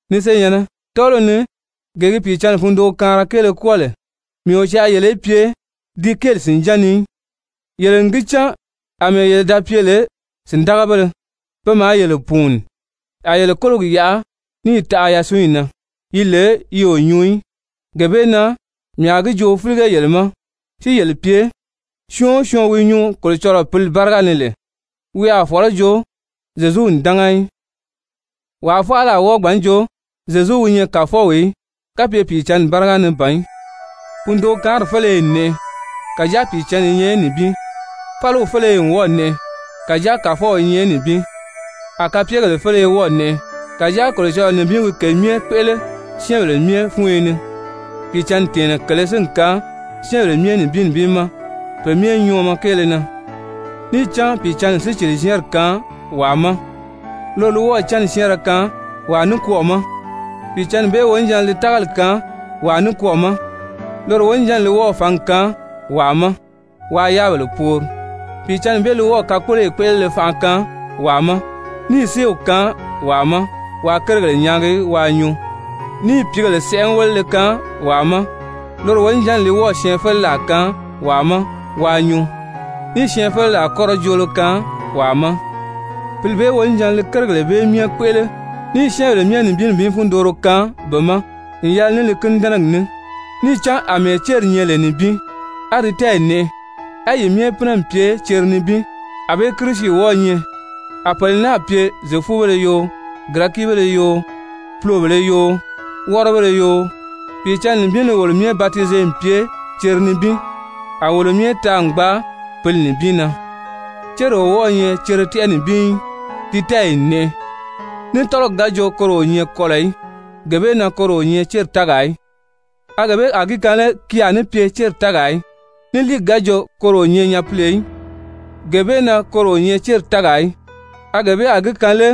Ni senyɛ̀nnɛ, tɔ́ɔliw ni gee gi Pìicǎnni fundookaanra kéele kwɔ́ɔ lè, mii o caa yele í pye di kéeli sìnján ni í. Yele n gi cán àmɛɛ yele da pye lè sìndagabéle, pe maa yele pùuni, a yele kólogi yaʔa, níì taʔa yasunyi na yi lè yi o nyuu í. Gee bee na mii a gi joo fílige yele ma si yele pye syɔɔn o syɔɔn wi nyuu Kolocɔlɔɔ Pǐli báriga ni lè, wi a fɔ̀lɔ́ jo, «Zyezu n dánga» í. Wàa faala a wɔ́ɔ gbǎn jo, «Zyezu wi nyɛ Kàfɔw» í, kapye Pìicǎnni báriga ni ban í. Fundookaanri féleye n nɛʔɛ, kàjáa Pìicǎnni i nyɛ nibin. Fáliw féleye n wɔ́ɔ̀ nɛʔɛ, kàjáa Kàfɔw i nyɛ nibin. A kapyegèle féleye wɔ́ɔ̀ nɛʔɛ, kàjáa Kolocɔlɔɔ nibin wi ke myɛ kpéʔele syɛ́ɛnbèle myɛ fúnyo ni. Pìicǎnni tɛ̀ɛnnɛ kèlē si n kaan syɛ́ɛnbèle myɛ nibin nibin ma pe myɛ nyɔɔmɔ kéele na. Níì cán Pìicǎnni n sícili-zyɛ́ɛnri kaan wàa ma. Loro li wɔ́ɔ̀ cánni syɛ́ɛnrɛ kaan wàa nikwɔɔ ma. Pìicǎnni bee wonijanna li tágali kaan wàa nikwɔɔ ma. Loro wonijanni li wɔ́ɔ̀ fǎngi kaan wàa ma waa yáabèle poori. Pìicǎnni bee li wɔ́ɔ̀ kakpoloyi kpéʔelele fanʔa kaan wàa ma, níì séew kaan wàa ma waa kérigèle nyaagi waa nyuu, níì pìígèle sɛʔɛwelele kaan wàa ma. Loro wonijanni li syɛɛnfeleraa kaan wàa ma waa nyuu, níì syɛɛnfeleraa kɔ́rɔ joolo kaan wàa ma. Pǐli bee wonijanna li kérigèle bee myɛ kpéʔele, níì syɛ́ɛnbèle myɛ nibin nibin fundooro kaan be ma n yɛlɛ ní li kínidɛnɛgi ní. Níì cán àmɛɛ céri nyɛ lè nibin, á di tɛ́ɛyi nɛʔɛ, á yi myɛ si pínɛ n pye cere nibin, ànbée Kirisi wɔ́ɔ̄ nyɛ. A pèle náà pye Zyefubéle yoo, Girɛkibéle yoo, pulobèlē yoo, wɔ́rɔbéle yoo, Pìicǎnni nibin li wolo myɛ batize n pye cere nibin, a wolo myɛ taa n gbaa Pǐli nibin na. Céri o wɔ́ɔ̄ nyɛ cere tɛ́ʔɛ nibin í, di tɛ́ɛyi n nɛʔɛ. Ní tɔ́lɔgi ga jo koro o nyɛ kɔlɔ̀ í, gee bee na koro o nyɛ céri tɛ́ɛgaa í, a gee bee a gi kaan lé ki a ní pye céri tɛ́ɛgaa í? Ní líigi ga jo koro o nyɛ nyapile í, gee bee na koro o nyɛ céri tɛ́ɛgaa í, a gee bee a gi kaan lé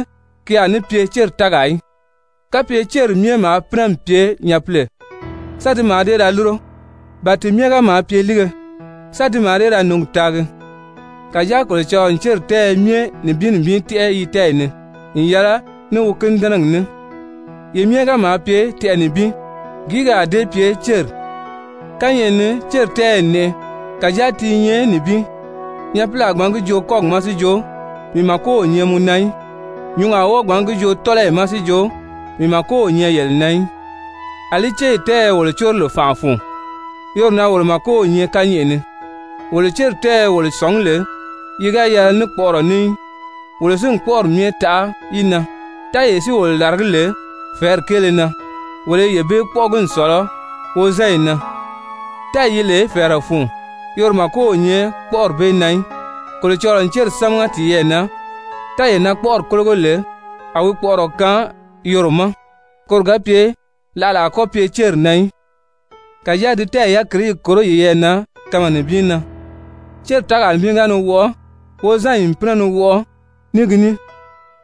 ki a ní pye céri tɛ́ɛgaa í? Kapye céri myɛ maa pínɛ n pye nyapile, sán ti mǎà dée ra lúro? Ba ti myɛ ga maa pye líige, sán ti mǎà dee ra nǔngi taagi? Kàjáa Kolocɔlɔɔ n céri tɛ́ɛyɛ myɛ nibin nibin tɛ́ʔɛ yi tɛ́ɛyi ni n yɛlɛ ní wi kínidɛnɛgi ní. Yi myɛ ga maa pye tɛʔɛ nibin, gìí ki a dée pye céri? Kányɛʔɛ ni céri tɛ́ɛyɛ n nɛʔɛ, kàjáa ti i nyɛ nibin. Nyapili a gbǎn gi joo kɔ́gi ma si jo: «Mii màko o nyɛ mɔ na í.» Nyǔngi a wɔ́ɔ gbǎn gi joo tɔ́lɔyi ma si jo: «Mii màko o nyɛ yele na í.» Alí céri tɛ́ɛyɛ wolo córo lè fànʔa fun, yoro na wolo màko nyɛ kányɛʔɛ ni. Wolo céri tɛ́ɛyɛ wolo sɔ̀ngí lè yi ga yɛlɛ ní kpɔʔɔrɔ ní í, wolo si n kpɔ́ʔɔri myɛ taʔa yi na. Tɛ́ɛyee si wolo làragí lè fɛ̀ɛ́ri kéele na, wolo i yee bee kpɔ́ʔɔgi n sɔ̀lɔ wozanyi na. Tɛ́ɛyi yi lè fɛ̀ɛrɛ fun, yoro màko o nyɛ kpɔ́ʔɔri bee na í. Kolocɔlɔɔ n céri sámaga tiyɛɛ na, tɛ́ɛyee na kpɔ́ʔɔri kólogo lè, a wi kpɔʔɔrɔ kaan yoro ma, koro ga pye láʔala a kɔ́ pye céri na í, kàjáa di tɛ́ɛyi yákirii í kòro yiyɛɛ na kanma nibin na. Céri tɛ́ɛgaa nibin ga ni wɔʔɔ, wozanyi n pínɛ ni wɔʔɔ ní gi ní.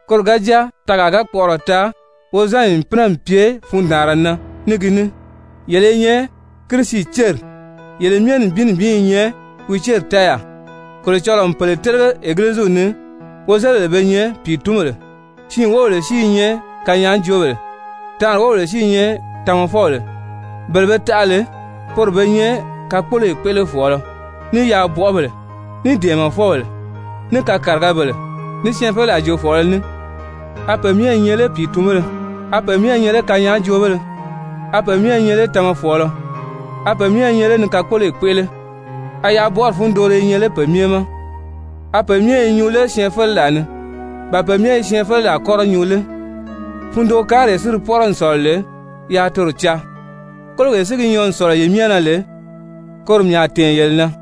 Koro ga jáa tɛɛgaa ga kpɔʔɔrɔ taa, wozanyi n pínɛ n pye fundaanra na ní gi ní. Yele i nyɛ Kirisi céri, yele myɛ nibin nibin i nyɛ wi céri tɛ́ɛyaa. Kolocɔlɔɔ n pèle télege Egiliziw ni, wozelibèle be nyɛ pìitunbèle, siin wóbèle si i nyɛ kanyaajoobèle, taanri wóbèle si i nyɛ tamafɔbèle. Bele be taʔa lè poro be nyɛ kakpoloyi kpéʔelefɔɔlɔ, ní yaabɔʔɔbèle, ní dɛ̀ɛmɛfɔbèle, ní kakarigabèle, ní syɛɛnfeleraa joofɔɔlɔ ní. A pe myɛ i nyɛ lé pìitunbéle? A pe myɛ i nyɛ lé kanyaajoobéle? A pe myɛ i nyɛ lé tamafɔɔlɔ? A pe myɛ i nyɛ lé ni kakpoloyi kpéʔele? A yaabɔʔɔri fundooro i nyɛ lé pe myɛ ma? A pe myɛ i nyuu lé syɛɛnfeleraa ni? Ba pe myɛ i syɛɛnfeleraa kɔ́rɔ nyuu lé? Fundookaanree di pɔ́rɔ n sɔ̀lɔ lè, yaa toro caa. Kólogee si gi nyɔɔ n sɔ̀lɔ yi myɛ na lè, koro mii a tɛ̀ɛn yele na.